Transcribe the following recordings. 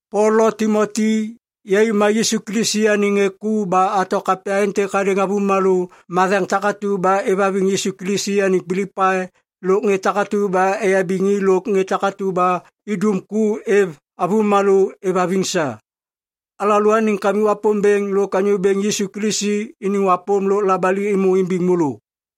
Pol lo Timoti, yai ma Yisu Kilisi anêŋ ŋê ku ba ato kapya êntêk hadêŋ avômalô matheŋ takatu ba êvhaviŋ Yisu Kilisi anêŋ Pilipai lôk ŋê takatu ba eyabiŋ i lôk ŋê takatu ba idum ku êv avômalô êvhaviŋ sa. Alalôaniŋ Kamik Wapômbêŋ lôk Anyô Bêŋ Yisu Kilisi iniŋ wapôm lôk labali êmô imbiŋ môlô.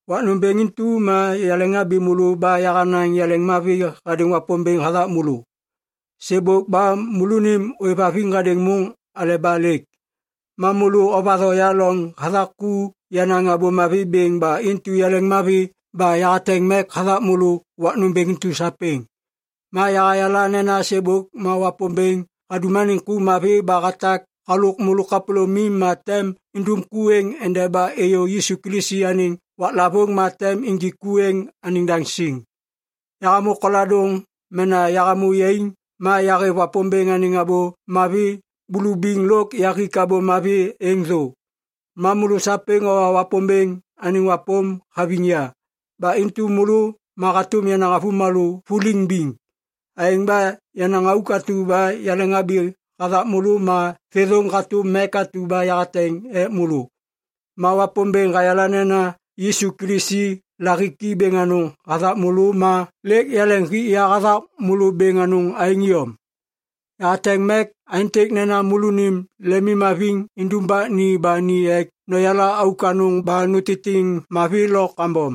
Wak nômbêŋ intu ma yaleŋhabi môlô ba yahanaŋ yaleŋmavi hadêŋ Wapômbêŋ hathak môlô. Sêbôk ba môlônim ôêvhaviŋ hadêŋ môŋ aleba lêk, ma môlô ovatho ya loŋ hathak ku yanaŋ Abô Mavi bêŋ ba intu yaleŋmavi ba yahateŋ mek hathak môlô wak nômbêŋ intu sapêŋ. Ma yahayala nena sêbôk ma Wapômbêŋ hadum anêŋ ku mavi ba hatak halôk môlô kapôlômim ma tem indum ku êŋ endeba êyô Yisu Kilisi anêŋ waklavôŋ ma tem injik ku êŋ anêŋ daŋ siŋ. Yahamô koladôŋ mena yahamô yaiŋ ma yahêv Wapômbêŋ anêŋ Abô Mavi bulubiŋ lôk yahik Abô Mavi êŋ thô, ma môlô sapêŋ owa Wapômbêŋ anêŋ wapôm haviŋ ya. Ba intu môlô ma hatôm yenaŋ avômalô vuliŋ biŋ. Aêŋ ba yenaŋ auk atu ba yaleŋhabi hathak môlô ma thêthôŋ hatôm mek atu ba yahateŋ ek môlô. Ma Wapômbêŋ hayala nena Yisu Kilisi lahiki bêŋ anôŋ hathak môlô ma lêk yaleŋ hik ya hathak môlô bêŋ anôŋ aêŋ iyom. Yahateŋ mek aêntêk nena môlônim lemimhaviŋ indumbak ni ba ni ek noyala auk anôŋ ba nutitiŋ mavi lo kambom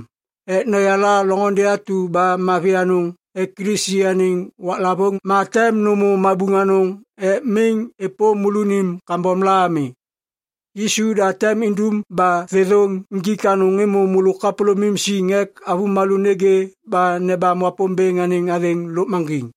ek noyala loŋôndê atu ba mavi anôŋ ek Kilisi anêŋ waklavôŋ ma tem nômô mabuŋ anôŋ ek miŋ êpôm môlônim kambom la ami. Yisu da tem indum ba thêthôŋ injik anôŋ êmô môlô kapôlômim siŋ ek avômalô nêgê ba nebam Wapômbêŋ anêŋ athêŋ lôkmaŋgiŋ.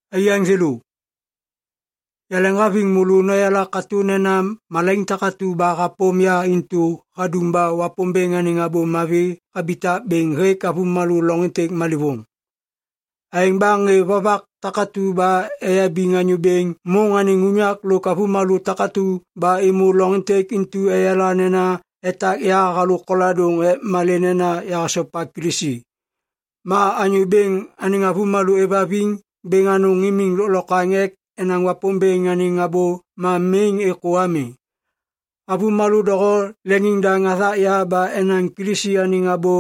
Aiyaŋ thêlô, yaleŋhaviŋ môlô noyala katô nena malaiŋ takatu ba hapôm ya intu hadum ba Wapômbêŋ anêŋ Abô Mavi habitak bêŋ hêk avômalô loŋ êntêk malêvôŋ. Aêŋ ba ŋê vovak takatu ba eyabiŋ anyô bêŋ môŋ anêŋ unyak lôk avômalô takatu ba êmô loŋ êntêk intu eyala nena etak ya halôk koladôŋ ek malê nena yahasopa Kilisi. Ma Anyô Bêŋ anêŋ avômalô êvhaviŋ bêŋ anôŋ imiŋ lôklokwaŋ ek enaŋ Wapômbêŋ anêŋ abô ma miŋ êkô ami. Avômalô doho leŋiŋdaŋ hathak ya ba enaŋ Kilisi anêŋ abô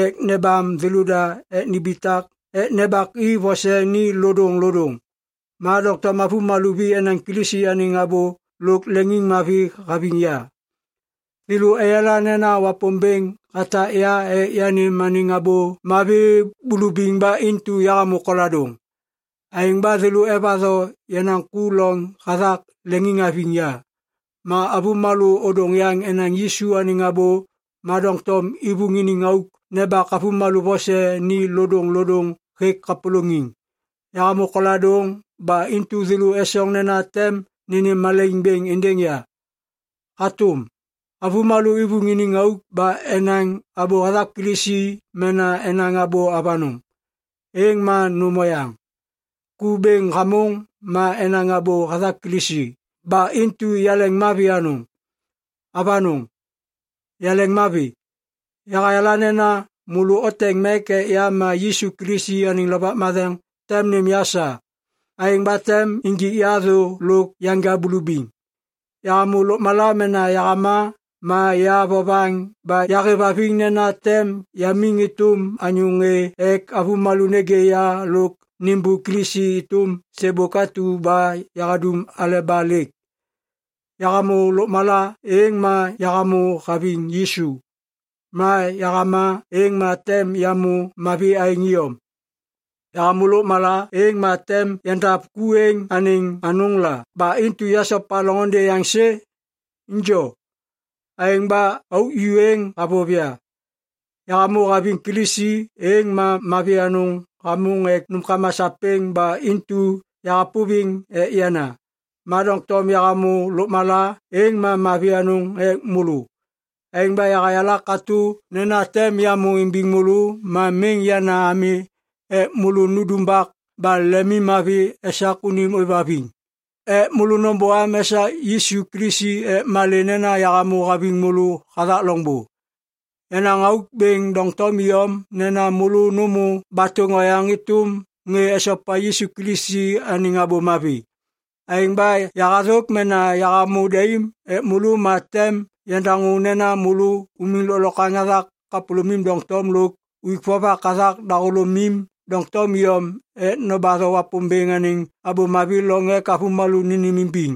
ek nebam thêlôda ek nembak i vose ni lodôŋlodôŋ. Ma doŋtom avômalô vi enaŋ Kilisi anêŋ abô lôk leŋiŋmavi haviŋ ya. Thêlô eyala nena Wapômbêŋ hatak ya ek yanêm anêŋ Abô Mavi bulubiŋ ba intu yahamô koladôŋ. Aêŋ ba thêlô evatho yenaŋ ku loŋ hathak leŋiŋhaviŋ ya. Ma avômalô ôdôŋ yaŋ enaŋ Yisu anêŋ abô ma doŋtom ivuŋ iniŋ auk nembak avômalô vose ni lodôŋlodôŋ hêk kapôlôŋiŋ. Yahamô koladôŋ ba intu thêlô esoŋ nena tem nênêm malaiŋ bêŋ êndêŋ ya. Hatôm. Avômalô ivuŋ iniŋ auk ba enaŋ abô hathak Kilisi mena enaŋ abô avanôŋ, êŋ ma nôm oyaŋ. Ku bêŋ hamôŋ ma enaŋ abô hathak Kilisi. Ba intu yaleŋmavi anôŋ. Avanôŋ! Yaleŋmavi! Yahayala nena môlô oteŋ mek ek ya ma Yisu Kilisi anêŋ Lovak Matheŋ tem nêm ya sa, aêŋ ba tem injik ya thô lôk yanja bulubiŋ. Yahamô lôkmala mena yahama ma ya vovaŋ ba yahêvhaviŋ nena tem yamiŋ êtôm anyô ŋê ek avômalô nêgê ya lôk nêmbô Kilisi êtôm sêbôk atu ba yahadum aleba lêk. Yahamô lôkmala, êŋ ma yahamô haviŋ Yisu. Ma yahama, êŋ ma tem yamô mavi aêŋ iyom. Yahamô lôkmala, êŋ ma tem yandav ku êŋ anêŋ anôŋ la. Ba intu yasopa loŋôndê yaŋ sê? Injo. Aêŋ ba auk ju êŋ havôv ya. Yahamô haviŋ Kilisi, êŋ ma mavi anôŋ hamôŋ ek nômkama sapêŋ ba intu yahapôviŋ ek yana. Ma doŋtom yahamô lôkmala, êŋ ma mavi anôŋ ek môlô. Aêŋ ba yahayala katô nena tem yamô imbiŋ môlô ma miŋ yana ami ek môlô nundumbak ba lemimmavi esak unim ôêvhaviŋ ek môlô nômbôam esak Yisu Kilisi ek malê nena yahamô haviŋ môlô hathak loŋbô. Yenaŋ auk bêŋ doŋtom iyom nena môlô nômô batôŋ oyaŋ êtôm ŋê esopa Yisu Kilisi anêŋ Abô Mavi. Aêŋ ba yahathôk mena yahamô daim ek môlô ma tem yandaŋô nena môlô umiŋ lôklokwaŋ hathak kapôlômim doŋtom lôk uik vovak hathak dahôlômim doŋtom iyom ek nobatho Wapômbêŋ anêŋ Abô Mavi loŋ ek avômalô nênêmimbiŋ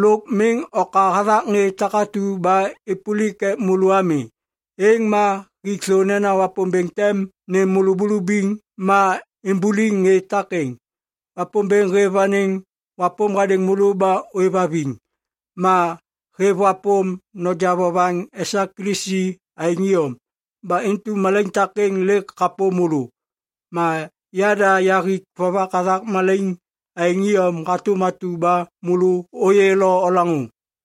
lôk miŋ oka hathak ŋê takatu ba êpôlik ek môlô ami. Êŋ ma hik thô nena Wapômbêŋ tem nêm môlô bulubiŋ ma imbuliŋ ŋê takêŋ. Wapômbêŋ hêv anêŋ wapôm hadêŋ môlô ba ôêvhaviŋ. Ma hêv wapôm noja vovaŋ esak Kilisi aêŋ iyom. Ba intu malaiŋ takêŋ lêk hapôm môlô. Ma yada yahik vovak hathak malaiŋ aêŋ iyom hatôm atu ba môlô ôyê lo olaŋô.